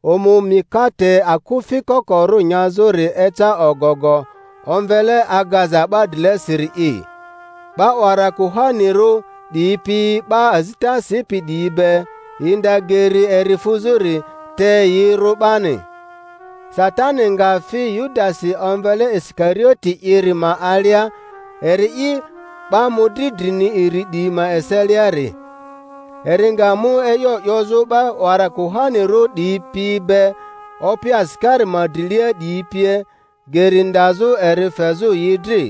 Omu mikate akufi kokorᴜ nyazᴜri eca ogogo, omvele Agaza 'ba drilesiri'i. 'Ba 'wara kuhanirᴜ 'diyi pi 'ba azita sipi 'diyi be yi nda geri eri fuzᴜri; te yi rᴜ 'bani. Satani nga fi Yudasi omvele Isikarioti'iri ma alia, eri'i 'ba mᴜdri drini iri 'diyi ma eseliari. Eri nga mu e'yo 'yozᴜ 'ba 'wara kuhanirᴜ 'diyi pi be, opi asikari ma drilia 'diyi pie, geri ndazᴜ eri fezᴜ yi dri.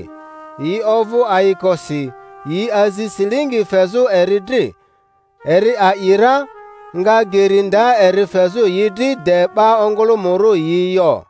Yi ovᴜ ayikosi, yi azi silingi fezᴜ eri dri. Eri a'i ra, nga geri nda eri fezᴜ yi dri de 'ba ongᴜlᴜmᴜrᴜ yi yo.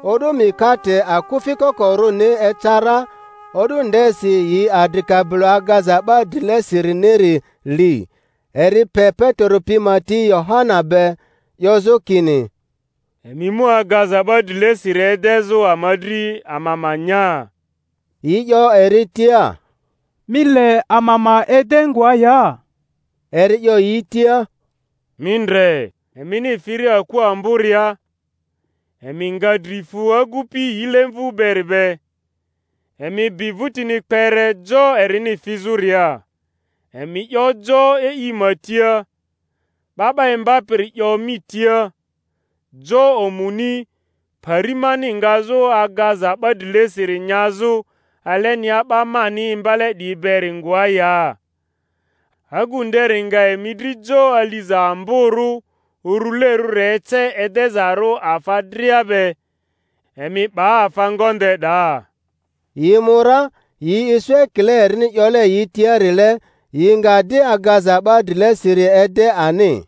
O'du mikate akufi kokorᴜni eca ra, o'du ndesi yi adri kabilo agaza 'ba drilesiriniri li. Eri pe Petero pi ma ti Yohana be, 'yozᴜ kini, Emi mu agaza 'ba drilesiri edezᴜ ama dri, ama ma nya. Yi 'yo eri tia, Mi le ama ma ede ngoa ya? Eri 'yo yi tia, Mi ndre, emini firia aku amboria, emi nga dri fu agupi yilemvᴜ beri be; emi bi vᴜtini kpere jo erini fizᴜria, emi 'yo jo e'i ma tia, 'Ba 'ba Imbapiri 'yo mi tia, Jo omuni, pari mani ngazᴜ agaza 'ba drilesiri nyazᴜ alenia 'ba mani imbale 'diyi beri ngoa ya? Agu nderi nga emi dri jo aliza amborᴜ urulerᴜri ece edezarᴜ afa dria be; emi 'ba afa ngonde 'daa. Yi mu ra, yi isu ekile erini 'yole yi tiarile; yi nga di agaza 'ba drilesiri ede ani.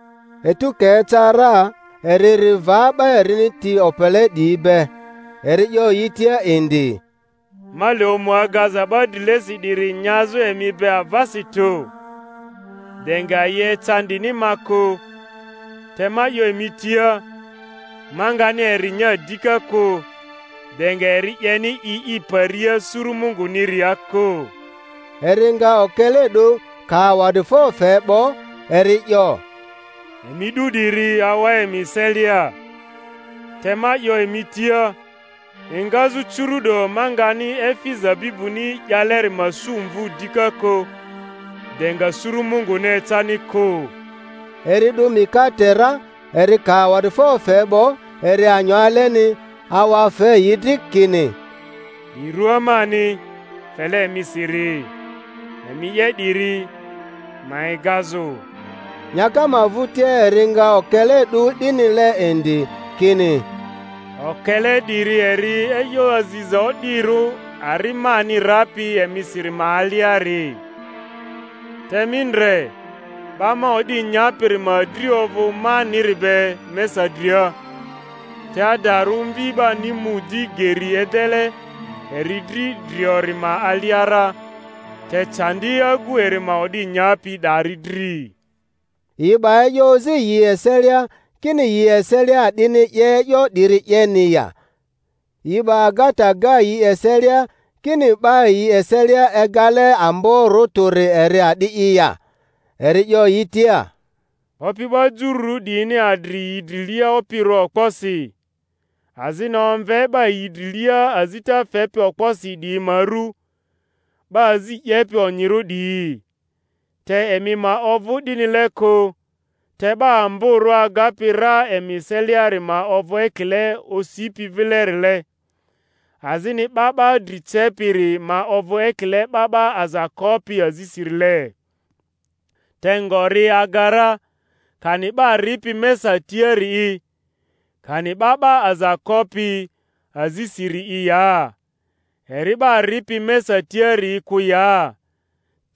Etu ka eca ra, eri ri va 'ba erini ti opele 'diyi be. Eri 'yo yi tia indi, Ma le omu agaza 'ba drilesi 'diri nyazᴜ emi be avasi tᴜ, de nga yi ecandini ma kᴜ; te ma 'yo emi tia, ma ngani eri nya dika kᴜ, de nga eri 'yeni i i paria suru Munguniria kᴜ. Eri nga okele 'du, ka awa'difo fe 'bo, eri 'yo, Emi 'du 'diri, awa emi eselia; te ma 'yo emi tia, engazᴜ curu'do ma ngani efi zabibuni 'yaleri ma su mvu dika kᴜ, de nga suru Munguni ecani kᴜ. Eri 'du mikate ra, eri ka awa'difo fe 'bo, eri anyo aleni, awa fe yi dri, kini, 'Di rua mani, fele emisiri. Emi 'ye 'diri ma egazᴜ. Nyaka ma vᴜtia eri nga okele 'du 'dinile indi, kini, Okele 'diri eri e'yo aziza o'dirᴜ ari mani rapi emisiri ma aliari. Te mi ndre, 'ba ma o'di nyapiri ma dri ovᴜ maniri be mesa dria. Te adarᴜ Mvi 'bani mu di geri edele eri dri driori ma alia ra; te candi agu eri ma o'di nyapi 'dari dri! Yi 'ba e'yo ozi yi eselia, kini yi eselia a'dini 'ye e'yo 'diri 'yeni ya. Yi'ba agata ga yi eselia, kini 'ba yi eselia egale amborᴜ tᴜri eri a'di'i ya. Eri 'yo yi tia, Opi 'ba jururᴜ 'diyini adri yi drilia opirᴜ okposi; azini omve 'ba yi drilia azita fepi okposi 'diyi ma ru, 'Ba azi 'yepi onyirᴜ 'diyi. Te emi ma ovᴜ 'dinile kᴜ; te 'ba amborᴜ agapi ra emi eseliari ma ovᴜ ekile osipi vilerile, azini 'ba 'ba dri cepiri ma ovᴜ ekile 'ba 'ba aza kopi azisirile. Te ngori aga ra, kani 'ba ripi mesa tiari'i, kani 'ba 'ba aza kopi azisiri'i ya? Eri 'ba ripi mesa tiari'i kᴜ ya?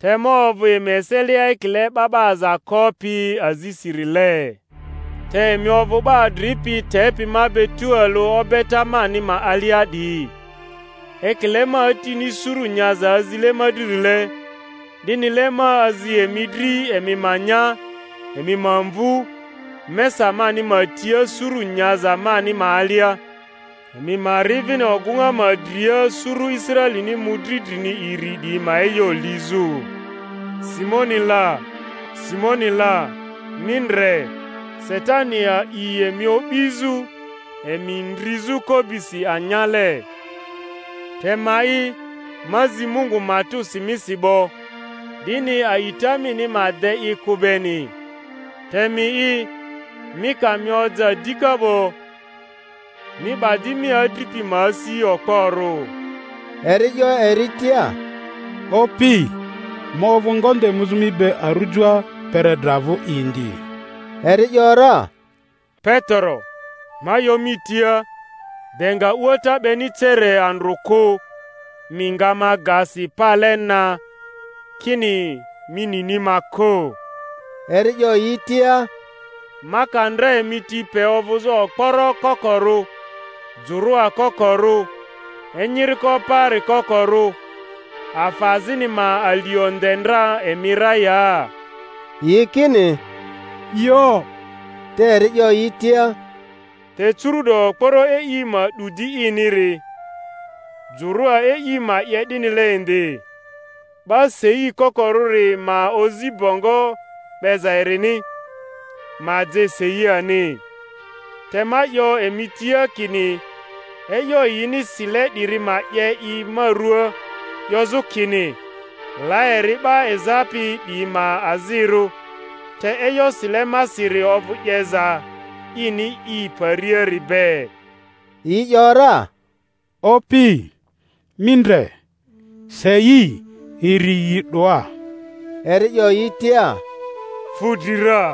Te ma ovᴜ emi eselia ekile 'ba 'ba aza kopi azisirile. Te emi ovᴜ 'ba adripi tepi ma be tualᴜ obeta mani ma alia 'diyi; ekile ma Atini suru nyaza azile ma dririle, 'dinile ma azi emi dri emi ma nya, emi ma mvu, mesa mani ma tia suru nyaza mani ma alia, emi ma ri vini ogᴜŋa ma dria suru Israelini mᴜdri drini iri 'diyi ma e'yo lizᴜ. Simoni la, Simoni la, mi ndre, Satani a'i emi o'bizᴜ, emi ndrizᴜ ko'bisi anyale. te ma'i, ma zi Mungu matᴜsi misi 'bo, 'dini a'ita mini ma de i kᴜ beni; te mi'i, mi ka mi oja dika 'bo, mi 'ba di mi adripi ma asi okporᴜ. Eri 'yo eri tia, Opi, ma ovᴜ ngonde muzᴜ mi be arujoa, kpere dra vᴜ indi. Eri ‘yora, Petero, ma 'yo mi tia, de nga a'uata 'beni cere andrᴜ kᴜ, mi nga ma ga si pale na, kini mi nini ma kᴜ. Eri 'yo yi tia, Ma ka ndra emi ti pe ovᴜzᴜ okporo kokorᴜ, jᴜrᴜa kokorᴜ, enyiriko paari kokorᴜ, afa azini ma alio nde ndra emi ra ya? Yi kini, Yo. Te eri 'yo yi tia, Te curu'do okporo e'i ma 'du di iniri, jᴜrᴜa e'i ma 'ye 'dinile indi. 'Ba sei kokorᴜri ma ozi bongo 'beza erini, ma je sei ani. Te ma 'yo emi tia kini e'yo yini sile 'diri ma 'ye i ma ruaa, 'yozᴜ kini, La eri 'ba ezapi 'diyi ma azirᴜ; te e'yo sile masiri ovᴜ 'yeza ini i pariari be. Yi ‘yora, Opi, mi ndre, sei iri yi 'doa. Eri 'yo yi tia, Fu dri ra.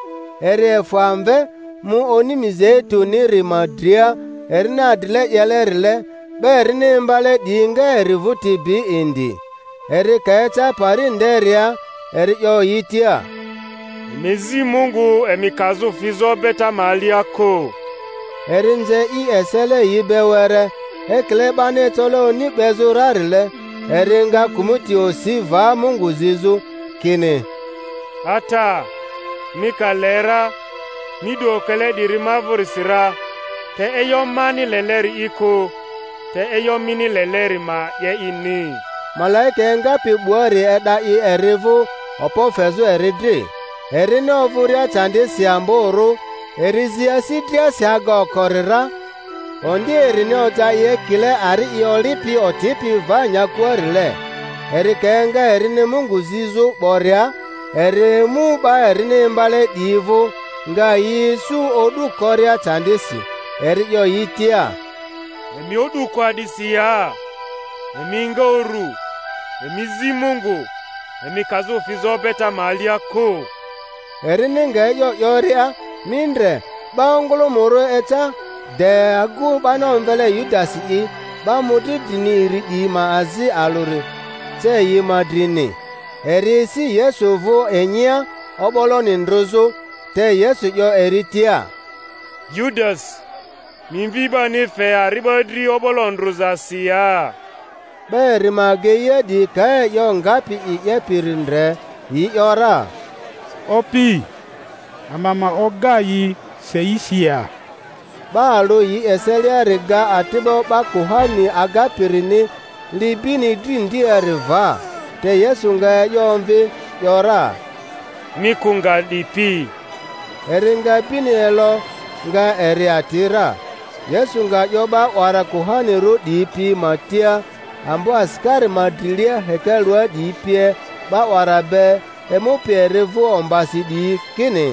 Eri efᴜ amve, mu oni Mizeitu-niri ma dria erini adrile 'yelerile; 'ba erini imbale 'diyi nga eri vᴜti bi indi. Eri ka eca pari nderia eri 'yo yi tia, Emi zi Mungu emi kazᴜ fizᴜ obeta ma alia kᴜ. Eri nze i esele yi be were, ekile 'bani ecole oni 'bezᴜ rarile, eri nga kᴜmᴜti osi va Mungu zizᴜ, kini, Ata, mi ka le ra, mi 'du okele 'diri ma vᴜrisi ra; te e'yo mani leleri'i kᴜ, te e'yo mini leleri ma 'ye'ini. Malaika engapi 'buari e'da i eri vᴜ, okpo fezᴜ eri dri. Erini ovᴜria candisi amborᴜ, eri zi asi driasi aga okori ra; ondi erini oja i ekile ari i olipi otipi va nyakuarile. Eri ka enga erini Mungu zizᴜ 'boria, eri emu 'ba erini imbale 'diyi vᴜ, nga yi isu o'du koria candisi; eri 'yo yi tia, Emi o'du ko a'disi ya? Emi enga uru, emi zi Mungu, emi kazᴜ fizᴜ obeta ma alia kᴜ. Erini nga e'yo 'yoria, mi ndre, 'ba ongᴜlᴜmᴜrᴜ eca, de agu 'bani omvele Yudasi'i, 'ba mᴜdri drini iri 'diyi ma azi alᴜri, ce yi ma drini. Eri esi Yesu vᴜ inyia, o'boloni ndrᴜzᴜ; te Yesu 'yo eri tia, Yudasi, mi Mvi 'bani fe ari'ba dri o'bolo ndrᴜzasi ya? 'Ba eri ma ageia 'diyi ka e'yo ngapi i 'yepiri ndre, yi ‘yora, Opi, ama ma oga yi seisi ya? 'Ba alᴜ yi eseliari ga ati'bo 'ba kuhani agapirini, li bini dri ndiari va. Te Yesu nga e'yo omvi ‘yora, Mi kᴜ nga 'dipi! Eri nga bini elo, nga eri ati ra. Yesu nga 'yo 'ba 'wara kuhanirᴜ 'diyi pi ma tia, ambo asikari ma drilia hekalua 'diyi pie, 'ba 'wara be, emupi eri vᴜ ombasi 'diyi, kini,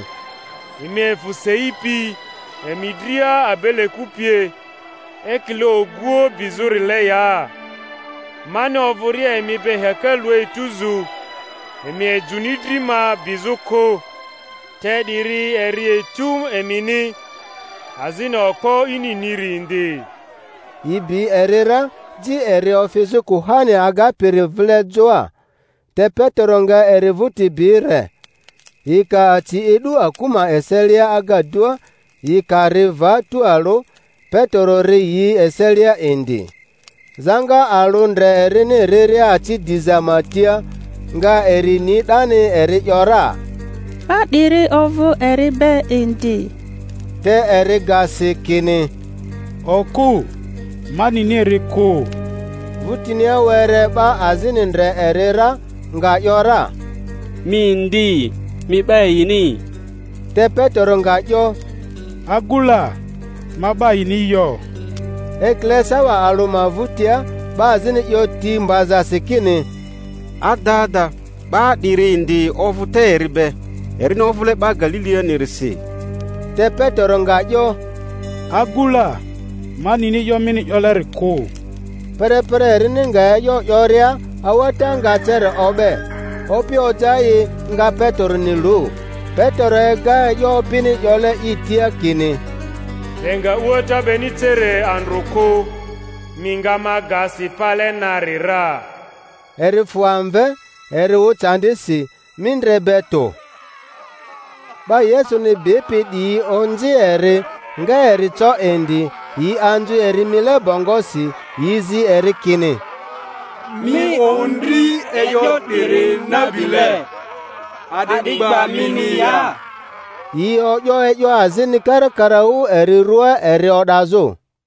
Emi efᴜ sei pi emi dria abe-leku pie, ekile oguoᴜ bizᴜrile ya? Mani ovᴜria emi be hekalua etuzu, emi ejᴜni dri ma bizᴜ kᴜ. Te 'diri eri etu emini, azini okpo ininiri indi. Yi bi eri ra, ji eri ofizᴜ kuhani agapiri vile joa. Te Petero nga eri vᴜti bi re. Yi ka aci edᴜ aku ma eselia agadua, yi ka ri va tualᴜ, Petero ri yi eselia indi. Zaŋa alᴜ ndre erini riria aci diza ma tia, nga eri ni 'dani, eri ‘yora, 'Ba 'diri ovᴜ eri be indi. Te eri ga si, kini, Okᴜ, ma nini eri kᴜ. Vᴜtinia were 'ba azini ndre eri ra, nga ‘yora, Mi indi, mi 'ba yini. Te Petero nga 'yo, Agu la, ma 'ba yini yo. Ekile sawa alᴜ ma vᴜtia, 'ba azini 'yo ti mbazasi kini, Adada, 'ba 'diri indi ovᴜ te eri be; erini ovᴜle 'ba Galilianirisi. Te Petero nga 'yo, Agu la, ma nini e'yo mini 'yoleri kᴜ. Perepere erini nga e'yo 'yoria, a'uata nga cere o'be. Opi oja i, nga Peteroni lu. Petero ega e'yo Opini 'yole i tia kini, De nga a'uata 'beni cere andrᴜ kᴜ, mi nga ma ga si pale nari ra. Eri fᴜ amve, eri wᴜ candisi, mindre be tᴜ. 'Ba Yesuni bipi 'diyi onzi eri, nga eri co indi; yi anzu eri mile bongosi, yi zi eri kini, Mi ondri e'yo 'diri nabile! A'di gba mini ya? Yi o'yo e'yo azini karakaraᴜ eri ruaa eri o'dazᴜ.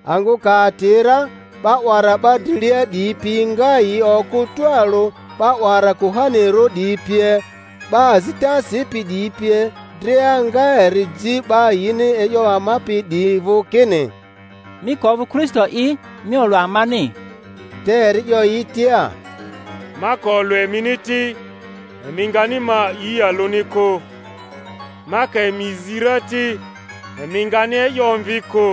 Angᴜ ka ati ra, 'ba 'wara 'ba drilia 'diyi pi nga yi okᴜ tualu 'ba 'wara kuhanirᴜ 'diyi pie, 'ba azita sipi 'diyi pie dria, nga eri ji 'ba yini e'yo amapi 'diyi vᴜ, kini, Mi ka ovᴜ Kristo'i, mi olᴜ amani. Te eri 'yo yi tia, Ma ka olᴜ emini ti, emi ngani ma a'i alᴜni kᴜ; ma ka emi zi ra ti, emi ngani e'yo omvi kᴜ.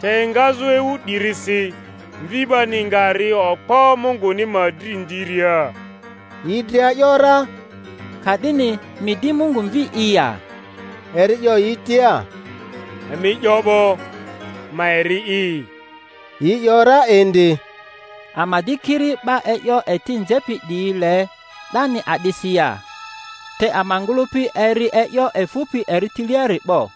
Te engazᴜ ewu 'dirisi Mvi 'bani nga ri okpo Munguni ma dri ndiria. Yi dria ‘yora, Ka'dini mi di Mungu Mvi'i ya? Eri 'yo yi tia, Emi 'yo 'bo; ma eri'i. Yi 'yo ra indi, Ama di kiri 'ba e'yo eti nzepi 'diyi le 'dani a'disi ya? Te ama ngᴜlᴜpi eri e'yo efᴜpi eri tiliari 'bo.